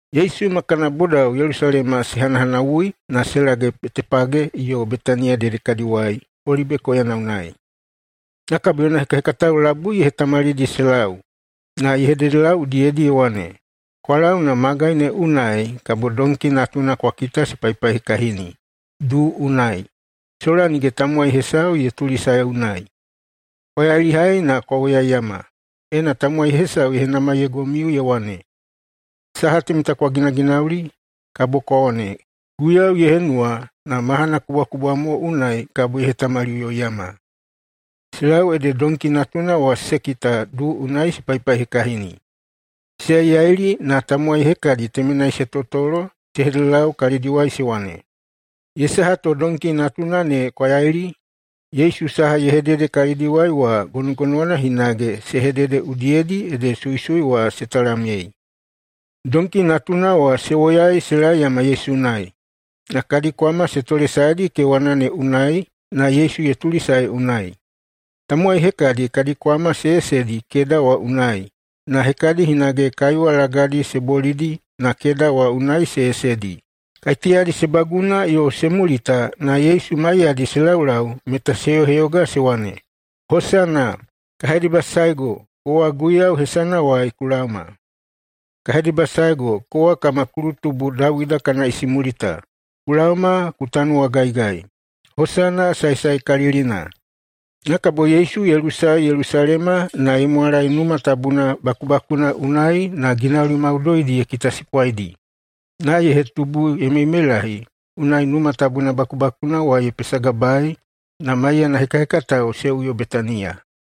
Yesu ma kana bodao Yelusalema se hanahanawui, na se lage Betepage yo Betaniya dedekadiwai, Olibe koyana unai. Na kabo yona hekahekatao labui ye hetamalidi se lau na ye hededelau udiyedi ye wane, “Kwa lau na magai ne unai kabo donki natuna kwa kita se paihekahini duu unai, sola nige tamowai hesau ye tulisae unai. Kwa yailihai na kwa woyaiyama. Ena tamowai hesau ye henamaiyeigomiu ye wane, ‘Saha temeta kwa ginaginauli?’, kabo kwa wane, ‘Guiyau ye henuwa na mahana kubwakubwa mo unai kabo ye hetamaliꞌuyoiyama.’” Se lau ede donki natuna wa se kita duu unai se paihekahini. Se yaiyaili, na tamowai hekadi temenai se totolo se hededelau kalidiwai se wane, “Ye saha to donki natuna ne kwa yaili?” Yesu saha ye hedede kalidiwai wa gonogonowana hinage se hedede udiyedi ede suisui wa se talamyei. Donki natuna wa se woyai se laeyama Yesu unai. Na kadi kwama se tolesaedi kewana ne unai, na Yesu ye tulisae unai. Tamowai hekadi kadi kwama se yesedi keda wa unai, na hekadi hinage kaiwa lagadi se bolidi na keda wa unai se yesedi. Kaiteyadi se baguna yo se mulita na Yesu maiyadi se laulau meta se heyoheyoga se wane, “Hosana!” “Ka hedebasaego, kowa Guiyau hesanawai ku laoma!” “Ka hedebasaego, kowa kama kulutubu Dawida kana isimulita. Ku laoma ku tanuwagaigai!” “Hosana saesaekalilina!” Na kabo Yesu ye lusae Yelusalema na ye mwalae Numa Tabuna bakubakuna unai na ginauli maudoidi ye kitasipwaidi. Na ye hetubu ye meimeilahi, unai Numa Tabuna bakubakuna wa ye pesagabae, na maiyana hekahekatao se uyo Betaniya.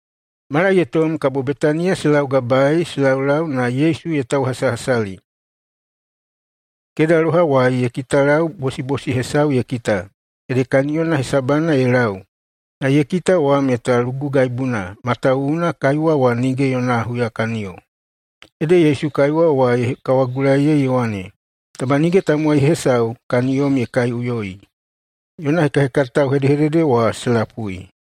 Mala ye tom kabo Betaniya se laugabae se laulau na Yesu ye tauhasahasali. Kedalohawai ye kitalau bosibosi hesau ye kita, ede kaniyona hesabana ye lau. Na ye kita wa meta lugugaibuna, matawuwuna kaiwa wa nige yona huyakaniyo. Ede Yesu kaiwa wa ye kawagulaiyei ye wane, “Taba nige tamowai hesau kaniyom ye kaiꞌuyoi.” Yona hekahekatao hedehedede wa se lapui.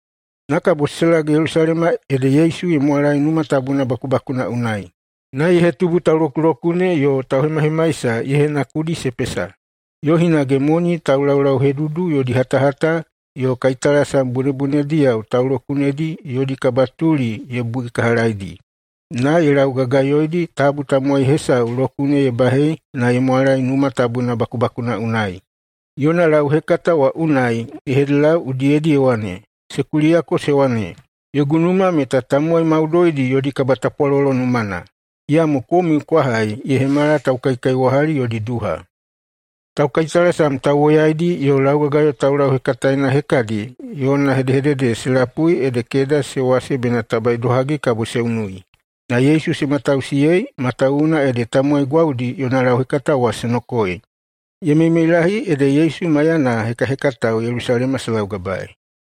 Na kabo se lage Yelusalema ede Yesu ye mwalae Numa Tabuna bakubakuna unai. Na ye hetubu taulokulokune yo tauhemahemaisa ye henakudi se pesa. Yo hinage moni taulaulauhedudu yodi hatahata yo kaitalasam bunebunediyao taulokunedi yodi kabatuli ye buikahalaidi. Na ye laugagayoidi tabu tamowai hesau lokune ye bahei na ye mwalae Numa Tabuna bakubakuna unai. Yona lauhekata wa unai ye hededelau udiyedi ye wane, “Se kuliyako se wane, ‘Yogu numa meta tamowai maudoidi yodi kabatapwalolo numana.’ Iyamo komiu kwa hai ye hemala taukaikaiwahali yodi duha.” Taukaitalasam tauwoyaidi yo laugagayo taulauhekataena hekadi yona hedehedede se lapui ede keda se wase bena taba idohagi kabo se unui. Na Yesu se matausiyei, matawuwuna ede tamowai gwaudi yona lauhekata wa se nokoei. Ye meimeilahi ede Yesu maiyana hekahekatao Yelusalema se laugabaei.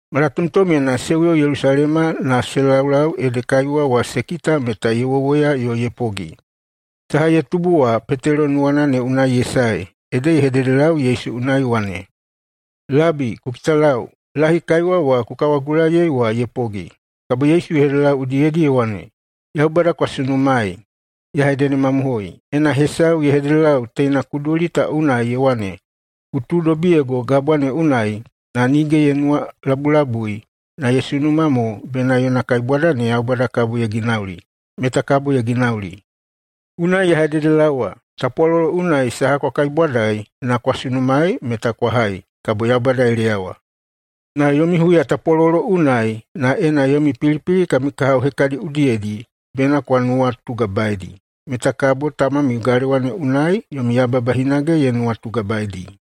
Malatomtomyena se uyo Yelusalema na se laulau ede kaiwa wa se kita meta ye wowoya yo ye pogi. Saha ye tubu wa Petelo nuwana ne unai ye sae ede ye hededelau Yesu unai ye wane, “Labi, ku kitalau! Lahi kaiwa wa ku kawagulaiyei wa ye pogi.” Kabo Yesu ye hededelau udiyedi ye wane, “Yaubada kwa sunumaei. Ya hededemamohoi: Ena hesau ye hededelau teina kuduli ta unai ye wane, ‘Ku tuudobiyego gabwa ne unai’, na nige ye nuwalabulabui, na ye sunuma mo bena yona kaibwada ne Yaubada kabo ye ginauli, meta kabo ye ginauli. Unai ya hededelaowa, tapwalolo unai saha kwa kaibwadai na kwa sunumaei meta kwa hai, kabo Yaubada ye leyawa. Na yomi huyatapwalolo unai, na ena yomi pilipili kami kahao hekadi udiyedi, bena kwa nuwatugabaeidi, metai kabo tamamiu galewa ne unai yomi yababa hinage ye nuwatugabaeidi.”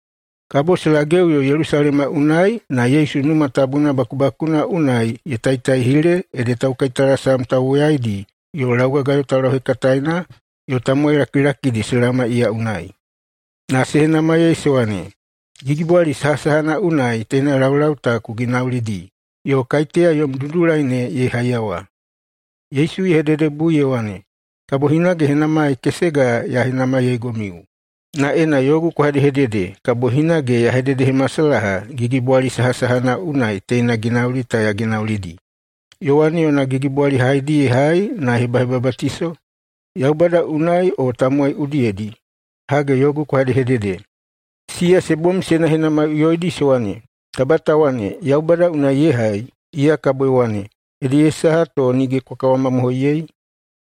Kabo se lageꞌuyo Yelusalema unai na Yesu Numa Tabuna bakubakuna unai ye taitaihile ede taukaitalasam tauwoyaidi yo laugagayo taulauhekataena yo tamowai lakilakidi se laoma iya unai na se henamaiyei se wane, “Gigibwali sahasahana unai teina laulau ta ku ginaulidi, yo kaiteya yom dudulai ne ye haiyawa?” Yesu ye hededebui ye wane, “Kabo hinage henamai kesega ya henamaiyeigomiu. Na ena yogu kwa hedehedede, kabo hinage ya hededehemasalaha gigibwali sahasahana unai teina ginauli ta ya ginaulidi. Yowane yona gigibwali haedi ye hai na ye hebahebabatiso? Yaubada unai o tamowai udiyedi? Hage, yogu kwa hedehedede.” Siya se bom se henahenamaiꞌuyoidi se wane, “Taba ta wane, ‘Yaubada unai ye hai’, iya kabo ye wane, ‘Ede ye saha to nige kwa kawamamohoiyei?’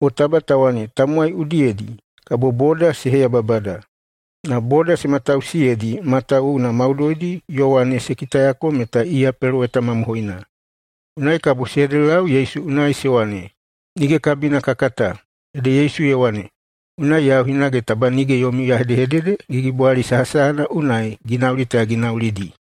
O taba ta wane, ‘Tamowai udiyedi’, kabo boda se heyababada.” Na boda se matausiyeidi, matawuwuna maudoidi Yowane se kitayako meta iya peloweta mamohoina. Unai kabo se hededelau Yesu unai se wane, “Nige kabina ka kata.” Ede Yesu ye wane, “Unai yau hinage taba nige yomiu ya hedehedede gigibwali sahasahana unai ginauli ta ya ginaulidi.”